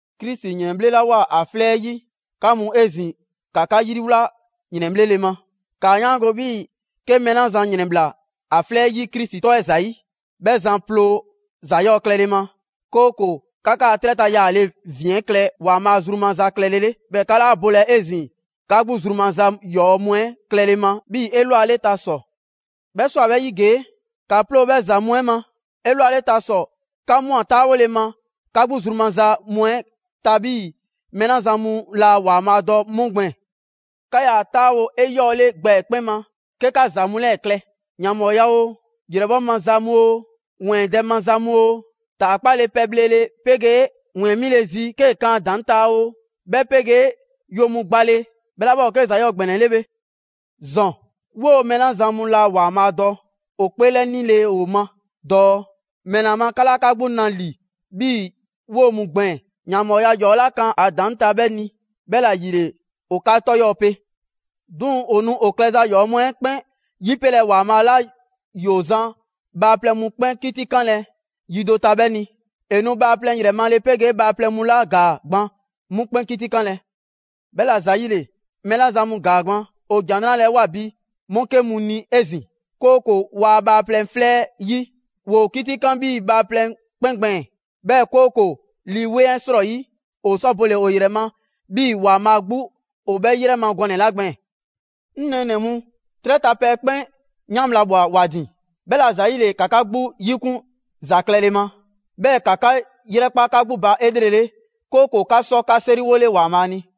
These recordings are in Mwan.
Krisi ‑yrɛnbhlelawoa ‑a 'flɛ 'ɛ 'yi, 'ka mu 'ezin‑, ‑ka 'ka 'yriwla yrɛnbhlele ma. ‑Kaa 'yaango‑ 'bhii‑ 'ke mɛɛ 'la zan ‑yrɛnbhla ‑a 'flɛ 'yi Krisi 'tɔ 'ɛ ‑zayi', 'bhɛ zan ploo ‑za 'yɔɔ‑ klɛle ma, 'kooko‑ 'ka 'kaa‑ 'trɛ ta yaale ‑vin 'ɛ klɛ ‑Waanbhaa' zru maza klɛle 'le, 'bhɛɛ‑ 'ka 'laa bolɛ 'ezin‑ 'ka 'gbu zru maza ‑yɔɔ' mu 'ɛ klɛle ma 'bhii‑ 'elwaleta ‑sɔ. 'Bhɛ ꞊swa 'bhɛ 'yi ‑gee'! ‑Ka 'ploo‑ 'bhɛ ‑za mu 'ɛ ma. Elwaleta ‑sɔ, 'ka ꞊mwa 'taawole ma 'ka 'gbu zru maza mu 'ɛ ta 'bhii‑ mɛɛ 'la zan mu laa ‑Waanbhaa' dɔ 'mu gbɛɛn‑. 'Ka 'yaa‑ 'taawo‑ 'eyɔɔle gbɛ 'ɛ 'kpɛn ma 'ke 'ka ‑za mu 'lɛɛ‑ klɛ: ‑yanbhɔɔya oo, ‑yrɛbhɔ' maza mu oo, ‑wɛɛndɛ' maza mu oo, ‑taakpale pɛ bhlele 'pegee ‑wɛɛn 'mile‑ zi 'ke 'kaa kan ‑a ‑daŋ' ta oo, 'bhɛ 'pegee‑ yo mu gbale, 'bhɛ 'la 'bhɛ ‑o 'ke ‑za 'yɔɔ‑ ‑gbɛnɛ 'le bhe. ‑Zɔn, 'woo‑ mɛɛ 'la zan mu laa ‑Waanbhaa' dɔ ‑o 'kpeelɛnile ‑o ma dɔɔ ‑mɛla ma 'ka 'laa 'ka 'gbu na ‑li 'bhii‑ 'woo‑ mu gbɛɛn‑ ‑yanbhɔɔya 'yɔɔ‑ 'la kan ‑a ‑daŋ' ta 'bhɛ ni; 'bhɛla‑ ‑yile ‑o 'ka 'tɔ 'yɔɔ‑ pe. 'Duŋ‑, ‑o nu ‑o klɛza ‑yɔɔ' mu 'ɛ 'kpɛn 'yipelɛ ‑Waanbhaa' 'la ‑yoo zan bhaaplɛŋ mu 'kpɛn 'kitikanlɛ yi do ta 'bhɛ ni. ‑E nu bhaaplɛŋ ‑yrɛ male 'pegee bhaaplɛŋ mu 'la ‑gaa gban 'mu 'kpɛn 'kitikanlɛ. 'Bhɛla‑ ‑zayile, mɛɛ 'la zan mu ‑gaa gban, ‑o ‑Jan 'Nrale‑ 'ɛ ꞊woa bi 'mu 'ke mu ni 'ezin‑, 'kooko‑ ‑waa' bhaaplɛŋ 'flɛ 'yi, ‑woo 'kitikan 'bhii‑ bhaaplɛŋ 'kpɛn gbɛɛn‑, 'bhɛɛ‑ 'kooko‑ Lii 'Weŋ 'ɛ 'srɔyi ‑o sɔ bole‑ ‑o ‑yrɛ ma 'bhii‑ ‑Waanbhaa' 'gbu ‑o 'bhɛ 'yrɛ ma gɔnɛ‑ 'la gbɛɛn‑. 'Ŋ nɛɛnɛ‑ mu, 'trɛ ta pɛ 'kpɛn 'yan bhla ꞊bhwa ‑wa ‑din. 'Bhɛla‑ ‑zayile, ‑ka 'ka 'gbu 'yikun ‑za klɛle ma, 'bhɛɛ‑ ‑ka 'ka 'yrɛkpa 'ka 'gbu ba 'elrele, 'kooko‑ 'ka sɔ 'ka 'seriwole ‑Waanbhaa' ni.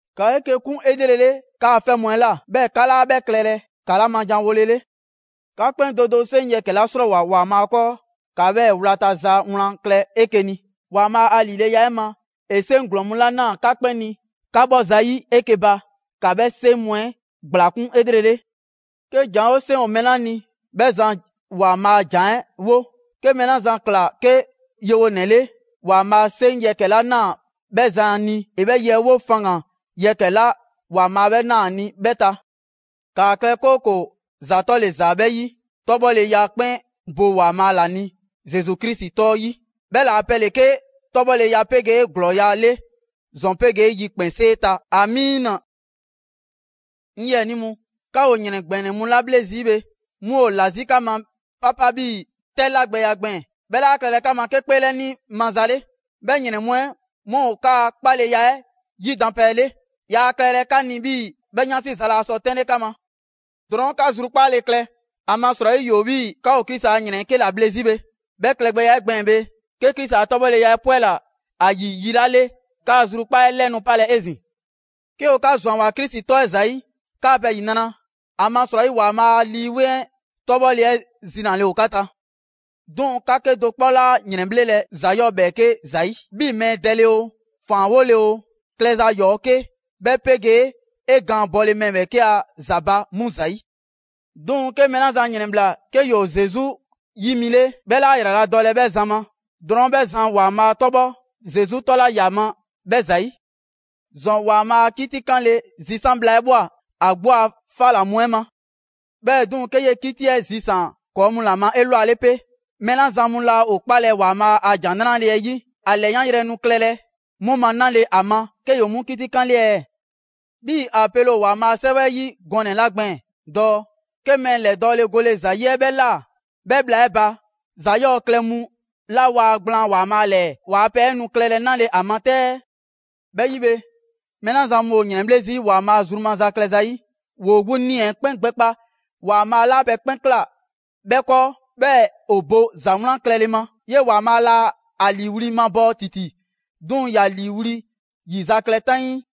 ‑Ka 'eke‑ 'kun 'elrele 'kaa‑ 'fɛ mu 'ɛ ꞊la, 'bhɛɛ‑ 'ka 'laa 'bhɛ klɛlɛ 'ka 'la ma janwolele. 'Ka 'kpɛn do do 'seŋ yɛkɛ‑ 'la 'srɔɔwoa‑ ‑Waanbhaa' 'kɔɔ, ‑ka 'bhɛɛ‑ wlata ‑za 'wlan klɛ 'eke‑ ni. ‑Waanbhaa' a ‑lileya 'ɛ ma, ‑e 'seŋ ‑glɔɔn mu 'la ꞊naa 'ka 'kpɛn ni 'ka 'bhɔ zayi' 'eke‑ ba, ‑ka 'bhɛ 'seŋ mu 'ɛ ‑gblakun' 'elrele. 'Ke ‑janwo' 'seŋ ‑o mɛɛ 'la ni, 'bhɛ zan ‑Waanbhaa' a ‑jan 'ɛ 'wo. 'Ke mɛɛ 'la zan ꞊kla 'ke yewonɛ 'le, ‑Waanbhaa' 'seŋ yɛkɛ‑ 'la ꞊naa 'bhɛ zan ni, ‑e 'bhɛ ye 'ɛ 'wo faŋgan‑ yɛkɛ‑ 'la ‑Waanbhaa' 'bhɛ na ‑a ni 'bhɛɛ‑ ta. ‑Kaa klɛ, 'kooko‑ ‑za 'tɔle‑ ‑za 'bhɛ 'yi, 'tɔbhɔleya 'kpɛn bo ‑Waanbhaa' ‑la ni Zesu Krisi 'tɔ 'yi. 'Bhɛ ‑laa pɛ ‑le 'ke 'tɔbhɔleya 'pegee ‑glɔɔya' 'le ‑zɔn pegee yikpɛnsee ta! ‑Amiina. 'Ŋ 'yiɛnii mu, 'ka ‑o ‑yrɛn ‑gbɛnɛ mu 'la 'bhle zii' bhe 'mu ‑o ‑la 'zi 'ka ma 'papa 'bhii‑ 'tɛ 'lagbɛya gbɛɛn‑. 'Bhɛ 'laa klɛlɛ 'ka ma 'ka 'kpeelɛni maza 'le. 'Bhɛ ‑yrɛn mu 'ɛ 'mu ‑o 'kaa 'kpaleya 'ɛ 'yidanpɛ 'le. Yaa klɛlɛ 'ka ni 'bhii‑ 'bhɛ 'yansi za laa sɔ 'tɛnle 'ka ma. Drɔɔn' 'ka zrukpaale klɛ, ‑amasrɔyi ‑yoo 'bhii‑ 'ka ‑o Krisi a ‑yrɛn 'ɛ 'ke ‑la bhle 'zi bhe. 'Bhɛ klɛgbɛya 'ɛ gbɛɛn‑ bhe, 'ke Krisi a 'tɔbhɔleya 'ɛ 'pwɛla‑ ‑a ‑yi yi 'la 'le, 'kaa‑ zrukpaa' 'ɛ 'lɛ nu 'palɛ‑ 'ezin‑. 'Ke ‑o 'ka ‑zwanwoa Krisi 'tɔ 'ɛ ‑zayi', 'kaa‑ pɛ ‑yinra', ‑amasrɔyi ‑Waanbhaa' a Lii 'Weŋ 'tɔbhɔle 'ɛ zinale ‑o 'ka ta! 'Duŋ‑, 'ka 'kedo‑ 'kpɔ 'laa ‑yrɛnbhlelɛ ‑za 'yɔɔ‑ ‑bhɛɛke' ‑zayi' 'bhii‑ mɛɛ dɛle oo, ‑faanwole oo, klɛza ‑yɔɔ' 'ke, 'bhɛ 'pegee ‑a gaan bɔle mɛɛ ‑bhɛɛke' ‑a ‑za ba, 'mu ‑zayi'. 'Duŋ‑, 'ke mɛɛ 'la zan ‑yrɛnbhla 'ke ‑yoo Zesu 'yi mi 'le, 'bhɛ 'laa ‑yraladɔlɛ 'bhɛ zan ma. Drɔɔn' 'bhɛ zan ‑Waanbhaa' 'tɔbhɔ Zesu 'tɔ 'la ‑ya ma 'bhɛ ‑zayi'. ‑Zɔn, ‑Waanbhaa' a 'kitikanle zisan' bhla 'ɛ ꞊bhwa ‑a 'gbu a 'fa ‑la mu 'ɛ ma. 'Bhɛɛ‑ 'duŋ‑ 'ke 'yee‑ 'kiti 'ɛ zisaan‑ ‑kɔɔ' mu ‑la ma 'elwale 'pe, mɛɛ 'la zan mu laa ‑o 'kpalɛ‑ ‑Waanbhaa' a ‑Jan 'Nrale‑ 'ɛ 'yi, ‑a ‑lɛyanyrɛ nu klɛlɛ 'mu ma 'nale‑ ‑a ma 'ke ‑yoo 'mu 'kitikanle ɛɛ? 'Bhii‑ ‑a pele ‑o ‑Waanbhaa' a 'Sɛwɛ 'ɛ 'yi gɔnɛ‑ 'la gbɛɛn‑ dɔɔ: «'Ke mɛɛ ‑lɛdɔɔle gole ‑za 'yi 'ɛ 'bhɛ ꞊laa, 'bhɛ bhla 'ɛ ba ‑za 'yɔɔ‑ klɛ mu 'la waa gblaan ‑Waanbhaa' ‑lɛɛ ‑waa' a pɛ 'ɛ nu klɛlɛ 'nale‑ ‑a ma 'tɛ ɛɛ?» 'Bhɛ 'yi bhe, mɛɛ 'la zan mu ‑o ‑yrɛnbhle' zii' ‑Waanbhaa' zru maza klɛ zayi', ‑woo 'gbu 'nii‑ 'ɛ 'kpɛn gbɛkpa ‑Waanbhaa' 'la pɛ 'kpɛn ꞊kla 'bhɛ 'kɔɔ, 'bhɛɛ‑ ‑o bo ‑za 'wlan klɛle ma. 'Yee‑ ‑Waanbhaa' laa a ‑liiwli' mabɔɔ ‑titi, 'duŋ‑ ‑ya ‑liiwli' ‑yizaklɛ 'taŋii.